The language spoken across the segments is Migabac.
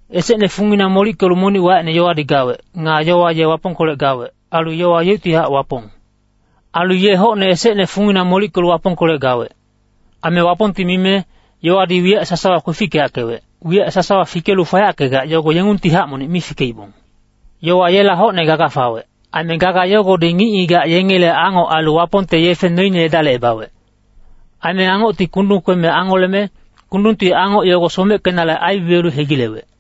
Esecne fungina molickelu, monic wacine Yowadi gawec. Nga Yowa ye Wapongkolec gawec. Ailu Yowa yeuctihac Wapong. Ailu ye hocne esecne fungina molickelu Wapongkolec gawec. Aime Wapongti mime Yowadi wiyac sasawa kwefickeyackewec. Wiyac sasawa fikelu fayackegac, yogo yengungtihac monic mi fikeibong. Yowa yela hocne gaga fawec. Aime gaga yogodi ngic-ngigac yengele Angoc ailu Wapongte yefe noine edalicebawec. Aime Angocti kundung kweme angoleme, kundungti Angoc yogo someckenale aibibiyelu hegilewec.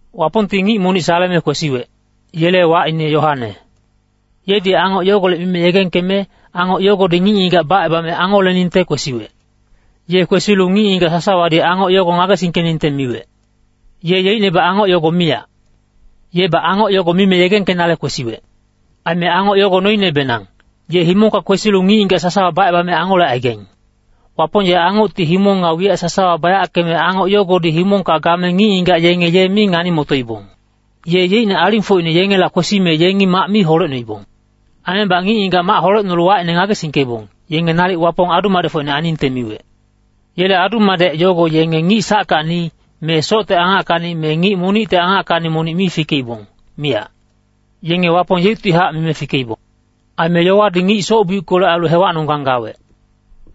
Wapongti ngic monic saleme kwesiwec, yele wacine Yoane. Yedi Angoc yogolec mime yegengkeme, Angoc yogodi ngic-ngigac bacebame angoleningte kwesiwec. Ye kwesilu ngic-ngigac sasawadi Angoc yogo ngagesingkeningte miwec. Ye yeicnebac Angoc yogo miyac. Yebac Angoc yogo mime yegengkenale kwesiwec. Aime Angoc yogo noinebenang, ye himongka kwesilu ngic-ngigac sasawa bacebame angolecaigaing. Wapong ye Angocti himong nga wiyac sasawa bayackeme, Angoc yogodi himongka game ngic-ngigac yenge ye mi ngani-motoibong. Ye yeicne alingfocine yengela kwesime yengi mac mi holecnoibong. Aimebac ngic-ngigac mac holecnolu wacine ngagesingkeibong, yenge nalic Wapong adu-madecfocine ainingte miwec. Yele adu-madec yogo yenge ngic sackacni, me socte angackacni me ngic monicte angackacni monic mi fikeibong, miyac. Yenge Wapong yeuctihac mime fikeibong. Aime Yowadi ngic soc-biuckolec ailu hewacnonggang gawec.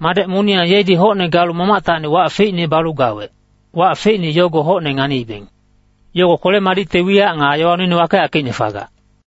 Madec moniyang yedi hocne galu Mamactacni wac feicne balu gawec, wac feicne yogo hocne nganiibeng. Yogo kwele-madicte wiyac nga yowa noine wakeyackeicne fagac.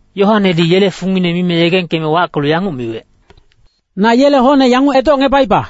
Yoanedi yele fungine mime yegengkeme wackelu yanguc miwec, “Na yele hocne yanguc edocngebaiba,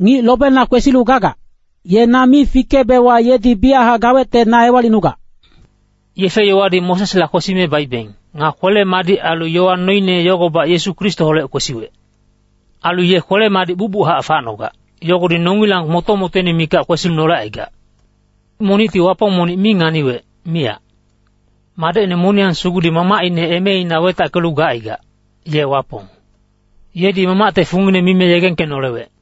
‘Ngic lobena kwesilu gagac, ye na mi fikeebewa yedi biyachac gawecte na ewalicnugac.’” Yefe-yowadi Mosesla kwesime baibeng. Nga kwele-madic ailu yowa noine yogobac Yesu Kristoholec kwesiwec. Ailu ye kwele-madic bucbuchac facnogac, yogodi nongilang moto-motoine mikac kwesinolecaigac. Monicti Wapong monic mi nganiwec, miyac. Madecine moniyang sugudi Mamacine emeina wetackelu gacaigac, ye Wapong. Yedi Mamacte fungine mime yegengkenolewec.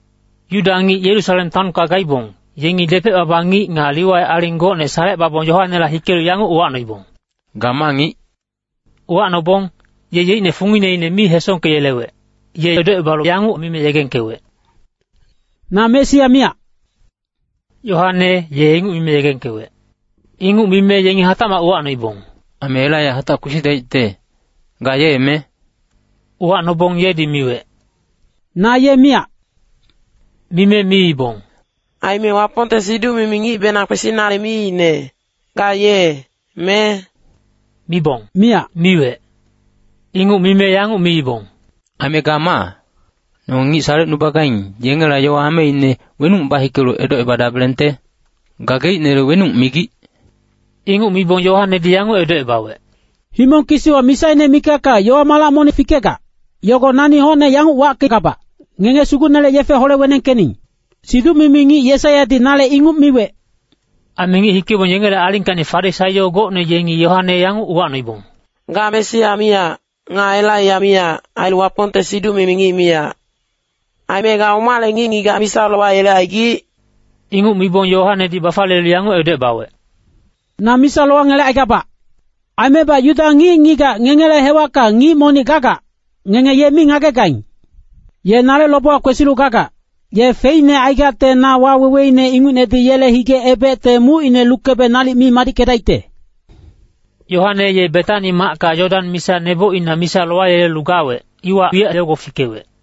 Yuda ngic Yerusalem taonka gaibong, yengi depec-baba ngic nga Liwai aling gocne salecebabong Yoanela hikelu yanguc uwacnoibong, “Ga ma ngic?” Uwacnobong, ye yeicne fungineine mi hesongkeyelewec. Ye edocebalu yanguc mime yegengkewec, “Na Mesia miyac.” Yoane ye inguc mime yegengkewec. Inguc mime yengi hatacmac uwacnoibong, “Aime Elaiya hatac kwesidaicte, ga ye, me?” Uwacnobong yedi miwec, “Na ye miyac.” Mime miibong, “Aime Wapongte siduc-mimi ngicbenang kwesinale miicne, ga ye, me?” Mibong “miyac” miwec. Inguc mime yanguc miibong, “Aime ga maa? Nonge ngic salecnubagaing, yengela yowa ameine wenuc bahikelu edocebadabelengte? Gageicnele wenuc migic?” Inguc mibong Yoanedi yanguc edocebawec, “Himong kisiwa misaine mikacka yowa-malac monic fikegac, yogo nani hocne yanguc wackegabac, ‘Ngenge Sugucnele yefe hole-wenengkening.’ Siduc-mimi ngic Yesaiyadi nale inguc miwec.” Aime ngic hikeibong yengele alingkacni Farisaio gocne yengi Yoane yanguc uwacnoibong, “Ga Mesia miyac, nga Elaiya miyac, ailu Wapongte siduc-mimi ngic miyac. Aime ga omale ngic-ngigac misa lowayelecaigic?” Inguc mibong Yoanedi bafaliyelu yanguc edocebawec, “Na misa lowangelecaigabac. Aimebac Yuda ngic-ngigac ngengele hewacka ngic monic gagac, ngenge ye mi ngagegaing. Ye nale lobewa kwesilu gagac, ye feicne aigacte na waweweine ingucnedi yele hige-ebecte mucine lukebe nalic mi madickedaicte.” Yoane ye Betani macka Yodan misa nebocina misa lowayelelu gawec, iwa wiyac yogo fikewec.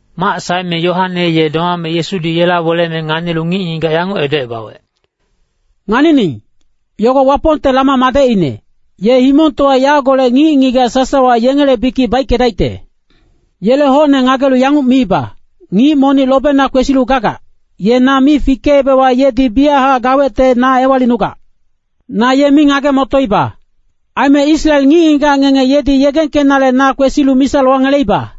Mac saeme Yoane ye domame Yesudi yela weleme nganilu ngic-ngigac yanguc edocebawec, “Nganining, yogo Wapongte lama madecine, ye himongtowa yagolec ngic-ngigac sasawa yengele bikic baickedaicte. Yele hocne ngagelu yanguc miiba, ‘Ngic monic lobena kwesilu gagac, ye na mi fikeebewa yedi biyachac gawecte na ewalicnugac. Na ye mi ngage-motoiba. Aime Israel ngic-ngigac ngenge yedi yegengkenale na kwesilu misa lowangeleiba.’”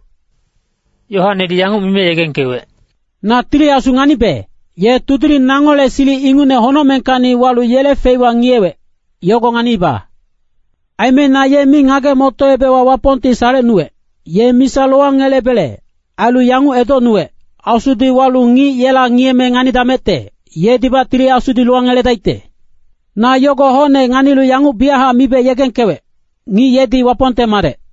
Yoanedi yanguc mime yegengkewec, “Na Tili Asu nganibe, ye tudiling nangole silic ingucne honocmengkacni walu yele feiwa ngiyewec, yogo nganiiba. Aime na ye mi ngage-motoebewa Wapongti salecnuwec, ye misa lowangelebele, ailu yanguc edocnuwec, ‘Asudi walu ngic yela ngiyeme nganidamecte, yedibac Tili Asudi lowangeledaicte.’ Na yogo hocne nganilu yanguc biyachac mibe yegengkewec, ngic yedi Wapongte Madec.”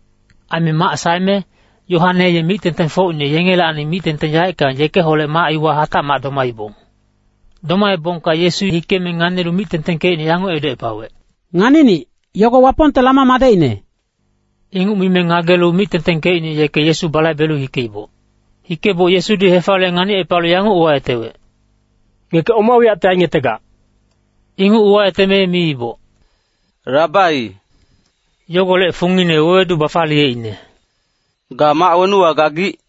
Aime mac saeme, Yoane ye mic-tengtengfocine yengelacni mic-tengteng yaeckang yekeholec mac iwa hatacmac domaibong. Domaebongka Yesu hikeme nganilu mic-tengtengkecine yanguc edocepawec, “Nganinic, yogo Wapongte lama madecine.” Inguc mime ngagelu mic-tengtengkecine yeke Yesu balaibelu hikeiboc. Hikeboc Yesudi hefaliye nganicepalu yanguc uwayetewec, “Ngeke oma wiyacte aingetegac?” Inguc uwayeteme miiboc, “Rabai,” (yogolec fungine wewedu bafaliyeicne) “ga mac wenuwa gagic?”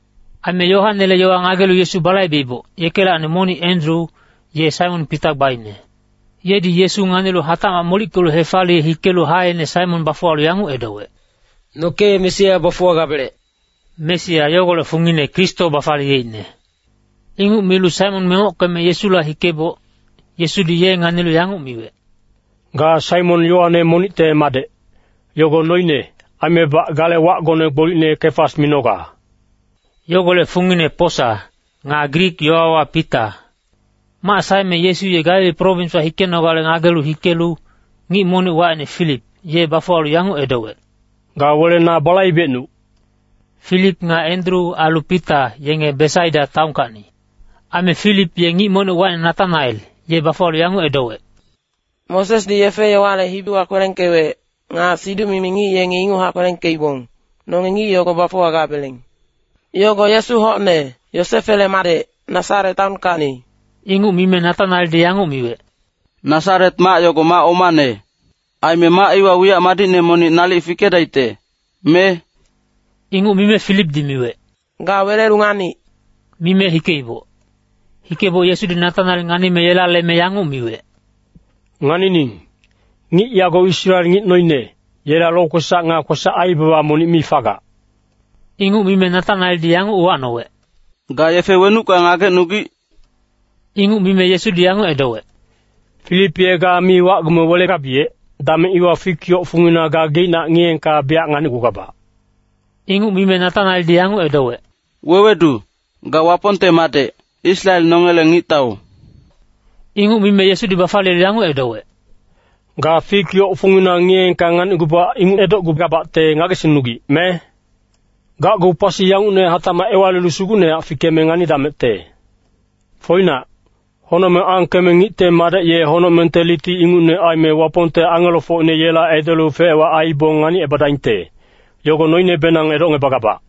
Aime Yoanele yowa ngagelu Yesu balaibeiboc, yekelacni monic Endru, ye Saimon Pita gbaine. Yedi Yesu nganilu hatacmac molickelu hefaliye hikelu haeine Saimon bafuwalu yanguc edowec, “Noke Mesia bafuwagabelec.” (Mesia yogolec fungine Kristo bafaliyeicne.) Inguc milu Saimon mengockeme Yesula hikeboc, Yesudi ye nganilu yanguc miwec, “Ga Saimon Yoane monicte madec, yogo noine. Aimebac gale wacgone gbolicne Kefas minoga.” (Yogolec fungine posa, nga Grik yowawa Pita.) Mac saeme Yesu ye Galili prowinswa hikenogale ngagelu hikelu, ngic monic wacine Filip, ye bafuwalu yanguc edowec, “Ga wele na balaibecnuc.” Filip nga Endru ailu Pita yenge Besaida taonkacni. Aime Filip ye ngic monic wacine Natanael, ye bafuwalu yanguc edowec, “Mosesdi yefe-yowale hibiwa kwelengkewec, nga siduc-mimi ngic yengi inguchac kwelengkeibong, nonge ngic yogo bafuwagabeleng. Yogo Yesu hocne, Yosefele madec, Nasaret taonkacni.” Inguc mime Natanaeldi yanguc miwec, “Nasaret mac yogo mac omane. Aime mac iwa wiyac madicne monic nalic fikedaicte, me?” Inguc mime Filipdi miwec, “Ga welelu nganic.” Mime hikeiboc. Hikeboc Yesudi Natanael nganime yela leme yanguc miwec, “Nganining, ngic yago Israel ngic noine, yela lokwesac nga kwesac-aibaba monic mi fagac.” Inguc mime Natanaeldi yanguc uwacnowec, “Ga yefe wenucka ngagecnugic?” Inguc mime Yesudi yanguc edowec, “Filip ye ga mi wacgume welegabiyec, dameng iwa fik yoc fungina ga geicnac ngiyeengka biyac nganicgugabac.” Inguc mime Natanaeldi yanguc edowec, “Wewedu, ga Wapongte Madec, Israel nongele Ngictau.” Inguc mime Yesudi bafaliyelu yanguc edowec, “Ga fik yoc fungina ngiyeengka nganicgubac inguc edocgugabacte ngagesingnugic, me? Gacgu pasi yangucne hatacmac ewalilu sugucnehac fikeme nganidamecte. Foinac, honocmeng angkeme Ngicte Madec ye honocmengte liti ingucne aime, Wapongte angelofocine yela edelu fec-wac aibong nganicebadaingte, yogo noinebenang edocngebagabac.”